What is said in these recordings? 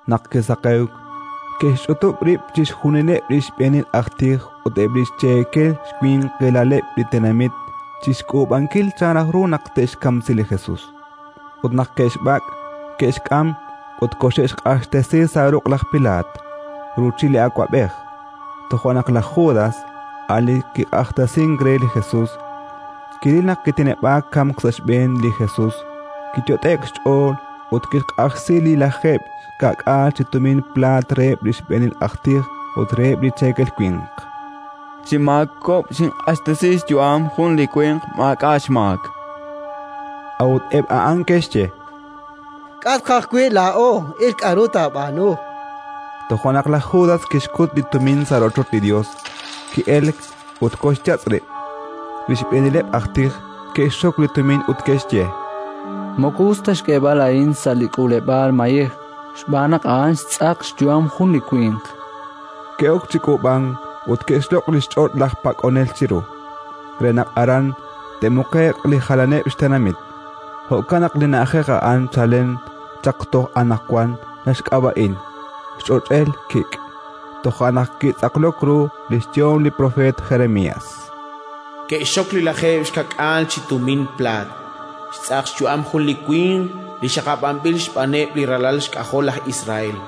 Naq kisaqewk, ke'xch'utub' rib' chixjunileb' li xb'eenil aj tij ut eb' li xcheekel winqilaleb' li tenamit chi xk'uub'ankil chan raj ru naq te'xkamsi li Jesus. Ut naq ke'xb'ak', ke'xk'am ut koxe'xq'axtesi sa' ruq' laj Pilaat, ruuchil li awab'ej. Toja' naq laj Judas, a' li kiq'axtesink re li Jesus, kiril naq kiteneb'aak kamk sa' xb'een li Jesus, kiyot'e'k xch'ool ut kixq'ajsi li lajeeb' xka'k'aal chi tumin plaat reheb' li xb'eenil aj tij ut reheb' li cheekel winq: —Xinmaakob'k, xinq'axtesi xyu'am jun li winq maak'a' xmaak, chan. A'ut eb' a'an ke'xye: —K'a' tqaj wi' laa'o? Il laa'at k'aru taab'aanu. Toja' naq laj Judas kixkut li tumin sa' rochoch li Yos, ki'elk ut koxyatz' rib'. Li xb'eenileb' aj tij ke'xxok li tumin ut ke'xye: —Moko us ta xk'eeb'al a'in sa' li k'uuleb'aal mayej, xb'aan naq a'an xtz'aq xyu'am jun li winq. Ke'ok chi k'uub'ank ut ke'xloq' li xch'och' laj pak'onel chiru, re naq aran te'muqe'q li jalaneb' xtenamit. Jo'kan naq li na'ajej a'an chalen chaq toj anaqwan naxk'ab'a'in: Xch'och'el kik'. Toja' naq kitz'aqlok ru li xyehom li propeet Jeremías: “Ke'xxok li lajeeb' xka'k'aal chi tumin plaat, xtz'aq xyu'am jun li winq, li xaqab'anb'il xb'aaneb' li ralal xk'ajol laj Israel,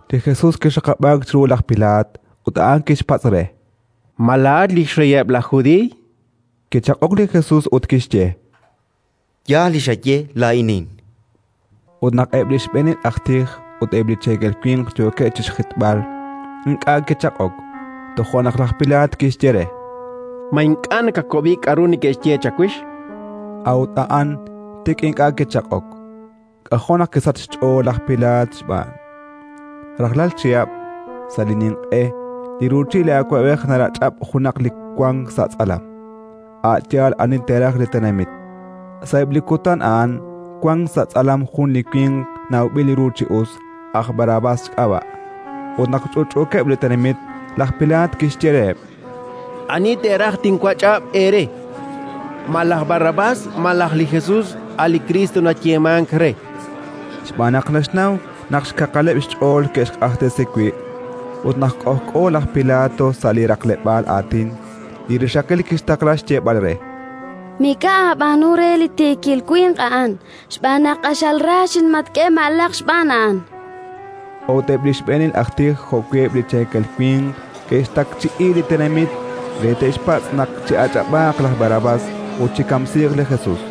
Li Jesus kixaqab'aak chiru li laj Pilaat, ut a'an kixpatz' re: —Ma laa'at li xreyeb' laj Judiiy? Kichaq'ok li Jesus ut kixye: —Yaal li xaye: laa'inin. Ut naq eb' li xb'eenil aj tij ut eb' li cheekel winq yookeb' chi xjitb'al, ink'a' kichaq'ok. Toja' naq laj Pilaat kixye re: —Ma ink'a' nakawab'i k'aru neke'xye chawix? A'ut a'an tik ink'a' kichaq'ok: k'ajo' naq kisachk xch'ool laj Pilaat xb'aan. Rajlal chihab', sa' li Ninq'e, li ruuchil li awab'ej narach'ab' junaq li wank sa' tz'alam, a' yaal ani te'raj li tenamit. Sa'eb' li kutan a'an wank sa' tz'alam jun li winq nawb'il ru chi us, aj Barrabás xk'ab'a'. Ut naq ch'utch'uukeb' li tenamit, laj Pilaat kixye reheb': —Ani teeraj tinwach'ab' eere, ma laj Barrabás malaj li Jesus, a' li Kriist nayeemank re? Xb'aan naq naxnaw naq xkaqaleb' xch'ool ke'xq'axtesi wi'. Ut naq k'ojk'o laj Pilato sa' li raqleb'aal aatin, li rixaqil kixtaqla xyeeb'al re: “Mik'a' aab'aanu re li tiikil winq a'an, xb'aan naq q'axal ra xinmatk'e ma'laq xb'aan a'an”. A'ut eb' li xb'eenil aj tij jo'wi' eb' li cheekel winq ke'xtakchi'i li tenamit re te'xpatz' naq chi'ach'ab'aaq laj Barrabás ut chikamsiiq li Jesus.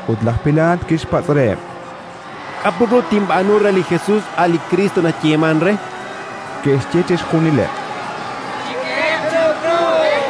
Ut laj Pilaat kixpatz' reheb': —K'a' put ru tinb'aanu re li Jesus, a' li Kriist nayeemank re? Ke'xye chixjunileb': —Chik'ehe'q chiru krus.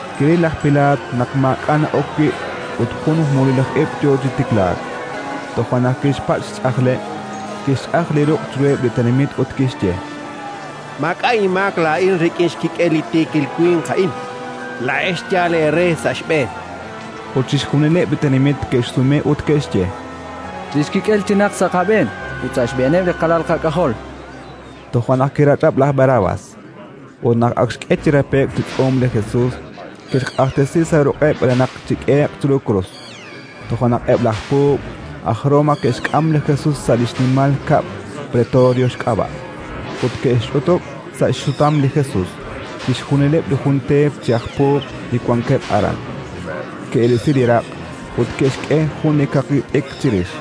Kiril laj Pilaat naq maak'a' na'ok wi' ut jun mululij ib' yo chi tiklaak; toja' naq kixpatz' xch'ajleb', kixch'aj li ruq' chiruheb' li tenamit ut kixye: —Maak'a' inmaak laa'in rik'in xkik'el li tiikil winq a'in. Laa'ex yaal eere sa' xb'een. Ut chixjunileb' li tenamit ke'xsume ut ke'xye: —Li xkik'el chinaq sa' qab'een ut sa' xb'eeneb' li qalal qak'ajol. Toja' naq kirach'ab' laj Barrabás; ut naq ak xk'e chi rape'k chi tz'uum li Jesus, kixq'axtesi sa' ruq'eb' re naq chik'ehe'q chiru krus. Toja' naq eb' laj puub' aj Roma ke'xk'am li Jesus sa' li xnimal kab'l pretorio xk'ab'a', ut ke'xch'utub' sa' xsutam li Jesus chixjunileb' li jun teep chi aj puub' li wankeb' aran. Ke'risi li raq' ut ke'xk'e jun li kaqi t'ikr chirix.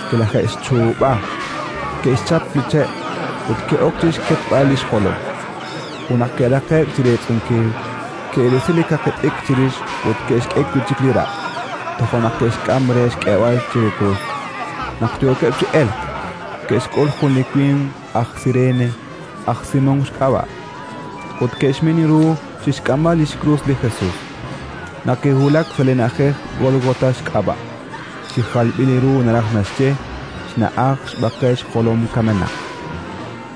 Kilaje'xchuub'a, ke'xchap li che' ut ke'ok chi xketb'al li xjolom. Ut naq ke'raqe'k chi reetz'unkil, ke'risi li kaqi t'ikr chirix ut ke'xk'e wi' chik li raq'. Toja' naq ke'xk'am re xk'eeb'al chiru krus. Naq yookeb' chi elk, ke'xk'ul jun li winq aj Sirene, aj Simón xk'ab'a', ut ke'xmin ru chi xk'amb'al li xkrus li Jesus. Naq ke'wulak sa' li na'ajej Gólgota xk'ab'a' (chi jalb'il ru naraj naxye: “Xna'aj xb'aqel xjolom kamenaq”),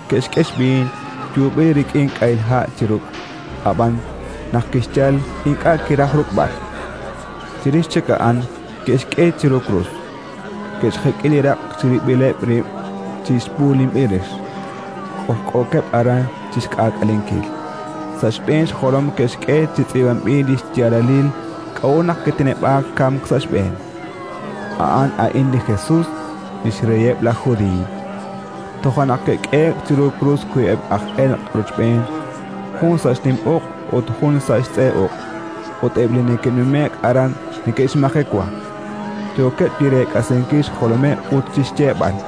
ke'xk'e xb'iin yuub'il rik'in k'ahil ha' chi ruk'; ab'an, naq kixyal, ink'a' kiraj ruk'b'al. Chirix chik a'an ke'xk'e chiru krus, ke'xjek'i li raq' chirib'ileb' rib' chi b'uulinb'il rix: k'ojk'ookeb' aran chi xk'aak'alenkil. Sa' xb'een xjolom ke'xk'e chi tz'iib'anb'il li xyaalalil k'a'ut naq kiteneb'aak kamk sa' xb'een: “A'an a'in li Jesus, li xReyeb' laj Judiiy”. Toja' naq ke'k'ehe'k chiru krus wiib'eb' aj elq' rochb'een, jun sa' xnim uq' ut jun sa' xtz'e uq'. Ut eb' li neke'nume'k aran neke'xmajewa, yookeb' chi reek'asinkil xjolomeb' ut chi xyeeb'al: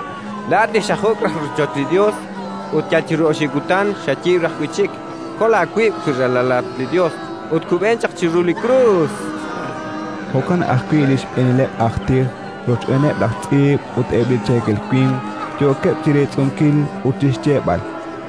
—Laa'at li xajuk' raj li rochoch li Yos ut yal chiru oxib' kutan xayiib' raj wi' chik, kol aawib', wi Ralalat li Yos, ut kub'en chaq chiru li krus. Jo'kan ajwi' li xb'eenileb' aj tij rochb'eeneb' laj tz'iib' ut eb' li cheekel winq yookeb' chi reetz'unkil ut chi xyeeb'al: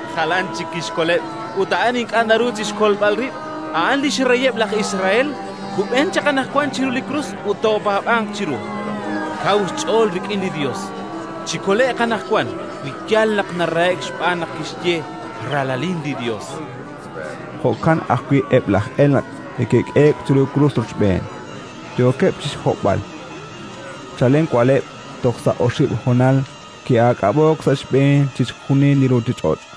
“Jalanatq chik kixkoleb', ut a'an ink'a' naruhank chi xkolb'al rib'! A'an li xreyeb' laj Israel! Kub'eeq chaq anaqwan chiru li krus ut toopaab'anq chiru. Kaw xch'ool rik'in li Yos. Chikole'q anaqwan, wi yaal naq narahe'k, xb'aan naq kixye: «Ralalin li Yos»”. Jo'kan ajwi' eb' laj elq' li ke'k'ehe'k chiru krus rochb'een, yookeb' chi xhob'b'al. Chalen wa'leb' toj sa' oxib' honal ki'aak'ab'o'k sa' xb'een chixjunil li ruuchich'och'.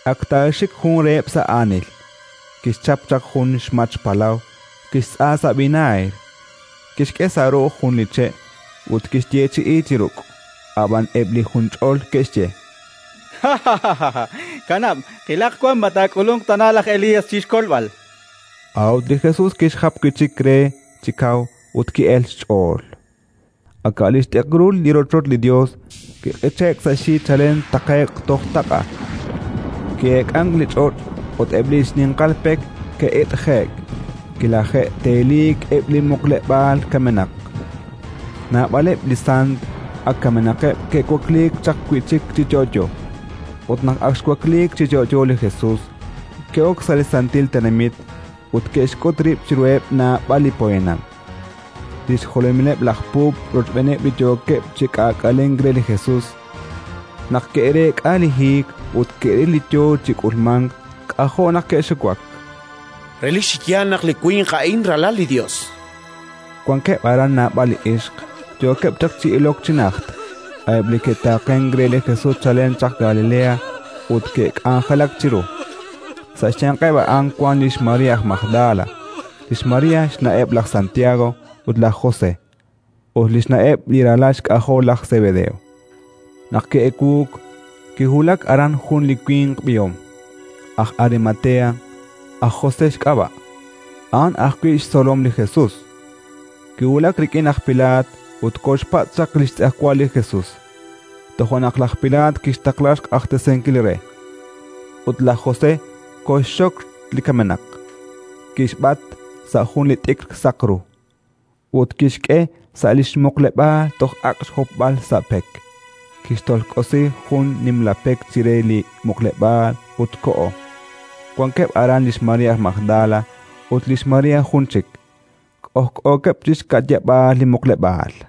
Ak taaxik jun reheb' sa' aanil, kixchap chaq jun xmach palaw, kixtz'a sa' vinaagr, kixk'e sa' ru'uj jun li che' ut kixyeechi'i chi ruk'. Ab'an eb' li junch'ol ke'xye: —Kanab', qilaq wan ma taak'ulunq tana laj Elías chi xkolb'al. A'ut li Jesus kixjap wi' chik re chi kaw ut ki'elk xch'ool. Aka' li xt'ikrul li rochoch li Yos kiq'iche'k sa' xyi chalen taqe'q toj taq'a. Ki'eek'ank li ch'och' ut eb' li xninqal pek ke'it'je'k. Kilaje'teliik eb' li muqleb'aal kamenaq, naab'aleb' li sant ak kamenaqeb' ke'wakliik chaq wi' chik chi yo'yo, ut naq ak xwakliik chi yo'yo li Jesus, ke'ok sa' li santil tenamit ut ke'xk'ut rib' chiruheb' naab'al li poyanam. Li xjolomileb' laj puub' rochb'eeneb' li yookeb' chi k'aak'alenk re li Jesus, naq ke'reek'a li hiik ut ke'ril li yo chi k'ulmank, k'ajo' naq ke'xiwak: —Relik chi yaal naq li winq a'in Ralal li Yos, chankeb'. Wankeb' aran naab'al li ixq, yookeb' chaq chi ilok chi najt, a'eb' li ke'taaqenk re li Jesus chalen chaq Galilea ut ke'k'anjelak chiru. Sa' xyanqeb' a'an wank lix María aj Magdala, lix María xna'eb' laj Santiago ut laj José, ut li xna'eb' li ralal xk'ajol laj Sebedeo. Naq ki'ewuuk, kiwulak aran jun li winq b'ihom, aj Arimatea, aj José xk'ab'a', a'an ajwi' xtzolom li Jesus. Kiwulak rik'in laj Pilaat ut koxpatz' chaq li xtz'ejwal li Jesus. Toja' naq laj Pilaat kixtaqla xq'axtesinkil re. Ut laj José koxxok li kamenaq, kixb'at sa' jun li t'ikr saq ru ut kixk'e sa' li xmuqleb'aal toj ak' xhopb'al sa' pek. Kixtolk'osi jun nimla pek chire li muqleb'aal ut koho. Wankeb' aran lix María aj Magdala ut lix María jun chik, k'ojk'ookeb' chi xka'yab'aal li muqleb'aal.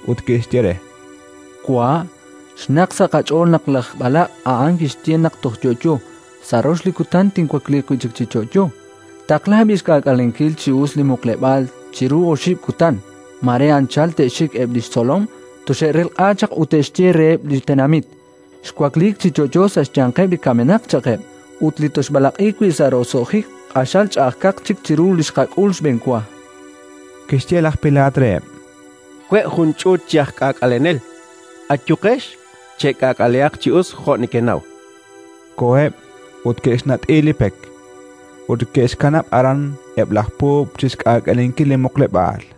ut ke'xye re: —Wa', xnaqk sa' qach'ool naq laj b'alaq' a'an kixye naq toj yo'yo: «Sa' rox li kutan tinwakliiq wi' chik chi yo'yo». Taqla b'i' xk'aak'alenkil chi us li muqleb'aal chiru oxib' kutan: mare anchal te'xik eb' li xtzolom, toxe'relq'a chaq ut te'xye reheb' li tenamit: «Xwakliik chi yo'yo sa' xyanqeb' li kamenaq», cha'qeb'. Ut li tooxb'alaq'i wi' sa' roso'jik q'axal ch'a'ajkaq chik chiru li xqak'ul xb'enwa. Kixye laj Pilaat reheb': —We' jun ch'uut chi aj k'aak'alenel. Ayuqex, chek'akalehaq chi us jo' nekenaw. Koheb' ut ke'xnat'i li pek; ut ke'xkanab' aran eb' laj puub' chi xk'aak'alenkil li muqleb'aal.